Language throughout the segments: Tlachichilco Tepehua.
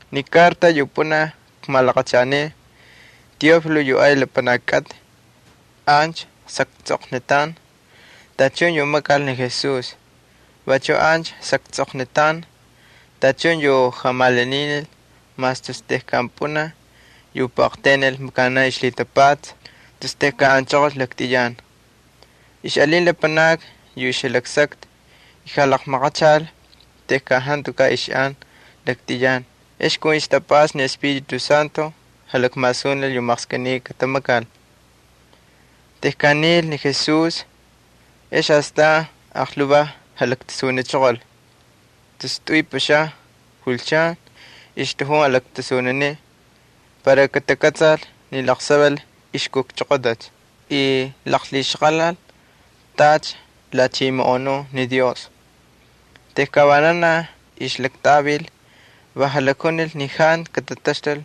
Ni karta yu pꞌunaj kmalaqachanin, Teófilo, ancha xaktsꞌoqnitan tachun yu makal ni Jesús. Vachu ancha xaktsꞌoqnitan tachun yu jamalaninil mas tus tejkan pꞌunaj yu puꞌaqtaynil makanaꞌ ixlhitapatsa tus tejkan anchoqol laktꞌiyan. Ixꞌalin lapanakni yu ixjalaksakta y jalaqmalaqachal tejkan jantukaꞌ ixꞌan laktꞌiyan, ex kun ixtapꞌasta ni Espíritu Santo jalakmasunil yu maqskꞌiniy katamakal. Tejkan nil ni Jesús ex astan aqlhuvaj jalaktasunichoqol. Tus tꞌuy pꞌuxaun julchan ixtꞌajun jalaktasuniniꞌ para katakꞌatsal ni laqsaval ixkujchoqotacha y laqlhixaqalal tacha lhachimoꞌonun ni Dios. Tejkan vananaj ixjalaktꞌavil va jalakjunil ni jantu katataxtul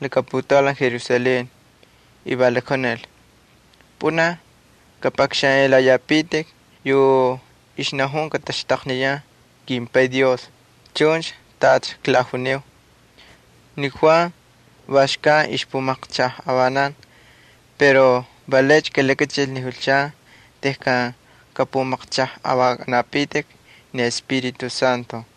laka putaulan Jerusalén, y va lakjunil: —Pꞌunaj kapꞌakxanꞌelayapitik yu ixnajun laqsaval kataxtaqniyan kimPay Dios chuncha tacha klajuniu. Ni Juan va xkan ixpumaqchajꞌavanan pero va laycha kalakachil ni julchan tejkan kꞌapꞌumaqchꞌajꞌavakꞌanapitik ni Espíritu Santo.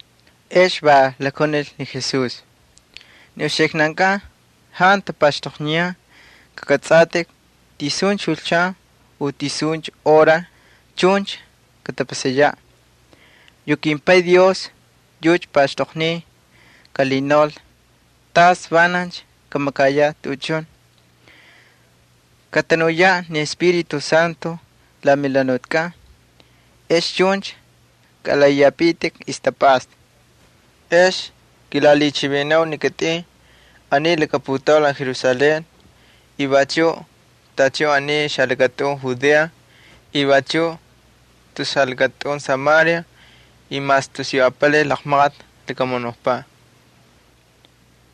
Ex va lakjunil ni Jesús: —Ni uxiknankꞌan jantu tapaxtoqniyan kakꞌatsꞌatꞌik tisuncha julchan u tisuncha hora chuncha katapasayaꞌ. Yu kimPay Dios yucha paxtoqniy kalhinaul tas vanancha kamakayaꞌ tuꞌuchun. Katanuyaꞌ ni Espíritu Santo la melhanutikꞌan ex chuncha kalaꞌaꞌiyapitik ixtapꞌasta. Ex kilalhichivinanau ni kitꞌin aniy laka putaulan Jerusalén y vachuꞌ tachun aniy xalakatꞌun Judea y vachuꞌ tus xalakatꞌun Samaria y mas tus yu apalay laqmaqati lakamunukpaꞌ.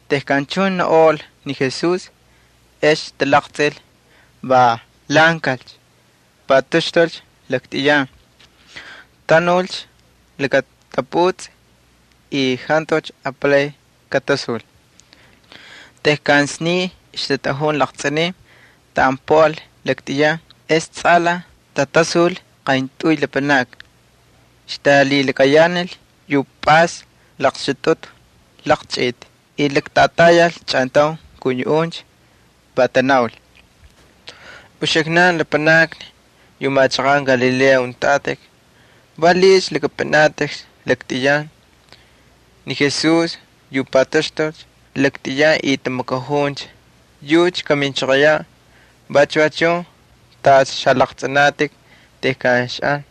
Tejkan chuncha naunꞌol ni Jesús ex talaqtsꞌil va lhaꞌankalcha, pataxtulcha laktꞌiyan. Tanulcha laka taputsꞌi, y jantucha apalay katasul. Tejkan sniy ixtatꞌajun laqtsꞌinin taꞌan puꞌal laktꞌiyan ex tsꞌalaj tatasul qayntꞌuy lapanakni. Ixtalhilakayanal yu pꞌays laqxutꞌutꞌu laqchꞌiti y laktꞌatayal chꞌantaun kun yuꞌuncha. Va tanaul: —Uxiknan, lapanakni yu machaqan Galilea untꞌatꞌik, ¿valiꞌiycha lakꞌapꞌinatꞌikcha laktꞌiyan? Ni Jesús yu pataxtulcha laktꞌiyan y tamakajuncha, yucha kaminchoqoyaꞌ vachu va chun tacha xalaqtsꞌinatꞌik tejkan xaꞌan.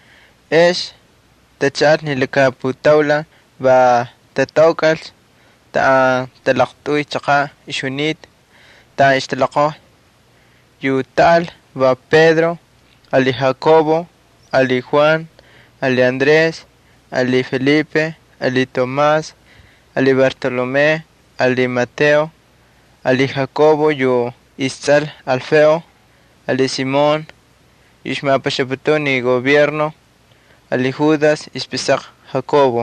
Ex tachaꞌalcha ni laka putaulan va tataukꞌalcha taꞌan talaqtꞌuy chaqaꞌ ixjunita taꞌan ixtaloqojya. Yu taꞌal va Pedro ali Jacobo ali Juan ali Andrés ali Felipe ali Tomás ali Bartolomé ali Mateo ali Jacobo yu istsꞌal Alfeo ali Simón yu ixmapaxaputun ni gobierno ali Judas ixpꞌisaqa Jacobo.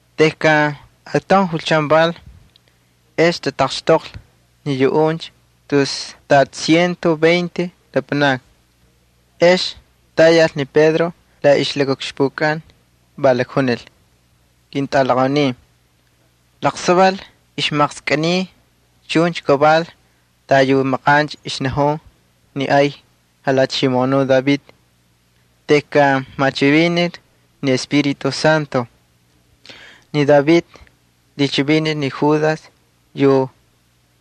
Tejkan ataun julchan val, ex tataqxtoqlhi ni yuꞌuncha tus tacha ciento veinte lapanakni. Ex tayal ni Pedro la ixlakaꞌukxpukꞌan, va lakjunil: —Ketꞌalaqaunin, laqsaval ixmaqskꞌiniy chuncha kaval tacha yu maqancha ixnajun ni ay jalhachimoꞌonuꞌ David tejkan machivinil ni Espíritu Santo. Ni David lhichivinil ni Judas yu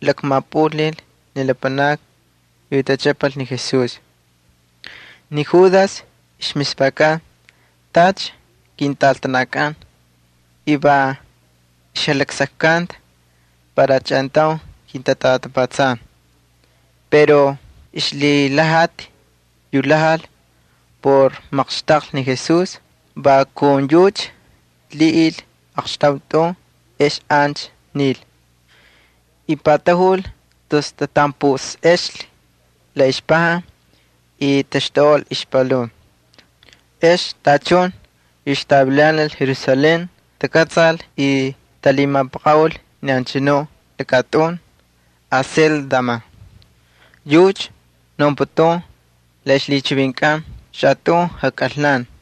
lakmapꞌulnil ni lapanakni yu tachꞌapal ni Jesús. Ni Judas ixmispakan tacha kintꞌaltanakꞌan y va ixlaksakkanta para chꞌantaun kintatꞌatapatsan. Pero yu ixlhilhajati yu lhajal por maqxtaqlhi ni Jesús va kun yucha lhiꞌil aqxtaun tꞌun ex ancha nil. Y patajul tus tatanpusꞌea la ixpajan y taxtuꞌol ixpalun. Ex tachun yu ixtavilanal Jerusalén takꞌatsal y talhimapaqaꞌul ni anchanuꞌ lakatꞌun Aseldama, yucha naunputun la ixlhichivinkꞌan Xatꞌun Jakꞌalnan.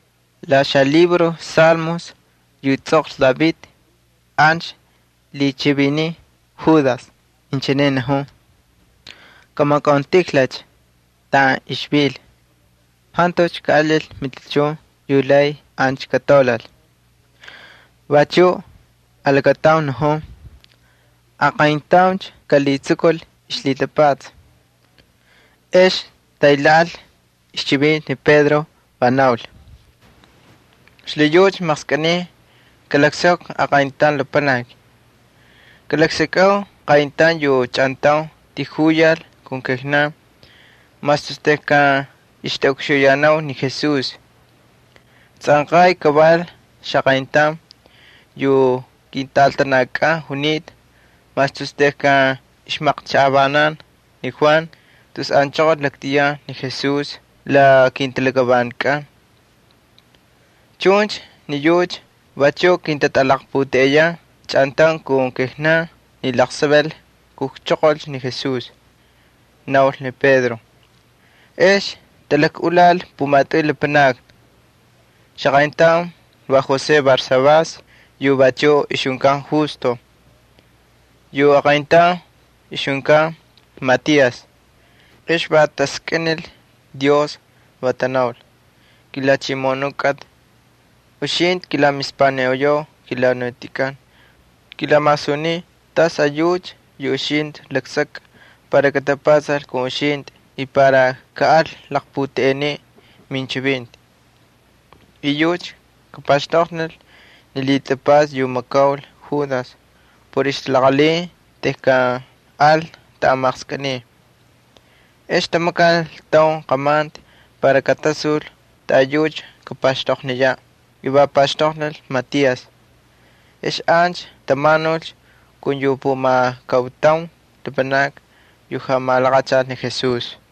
La xalibro Salmos yu tsꞌoqlhi David, ancha lhichiviniy Judas, inchine najun: Kamakauntijlalcha taꞌan ixvil, jantucha kaꞌalil matichun yu lay ancha kataulal. Vachuꞌ alakataun najun: Aqayntauncha kalhitsukul ixlhitapatsa. Ex taylhaanil ixchivinti ni Pedro, va naul: —Xlhiyucha maqskꞌiniy kalaksakvi aqayntaun lapanaki. Kalaksakꞌau qayntaun yu chꞌantaun tijuyal kun kijnan mas tus tejkan ixtꞌaꞌukxuyanau ni Jesús. Tsꞌanqay kaval xaqayntaun yu kintꞌaltanakꞌan junita mas tus tejkan ixmaqchajꞌavanan ni Juan tus anchoqol laktꞌiyan ni Jesús la kintalakavantikꞌan. Chuncha ni yucha vachuꞌ kintatꞌalaqputeꞌeyan chꞌantaun kun kijnan ni laqsaval kujchoqolcha ni Jesús —naul ni Pedro. Ex talakꞌulal pumatꞌuy lapanakni. Xaqayntaun va José Barsabás yu vachuꞌ ixjunkan Justo. Yu aqayntaun ixjunkan Matías. Ex va taskꞌinil ni Dios va tanaul: —KiJalhachimoꞌonuꞌ kꞌatꞌi. Uxintꞌi kilamispaniꞌoyau kelhanutikꞌan. Kilamasuniu tas ayucha yu uxintꞌi laksakꞌa para katapatsal kun uxintꞌi y para kaꞌal laqputeꞌeniꞌ minchivinti. Va yucha kapaxtoqnil ni lhitapatsa yu makaul Judas por ixtalaqalhin tejkan al taꞌan maqskꞌiniy. Ex tamakal taun qamanti para katasul taꞌayucha kapaxtoqniyaꞌ y va paxtoqnil Matías. Ex ancha tamanulcha kun yu pumakautaun lapanakni yu jamalaqachal ni Jesús.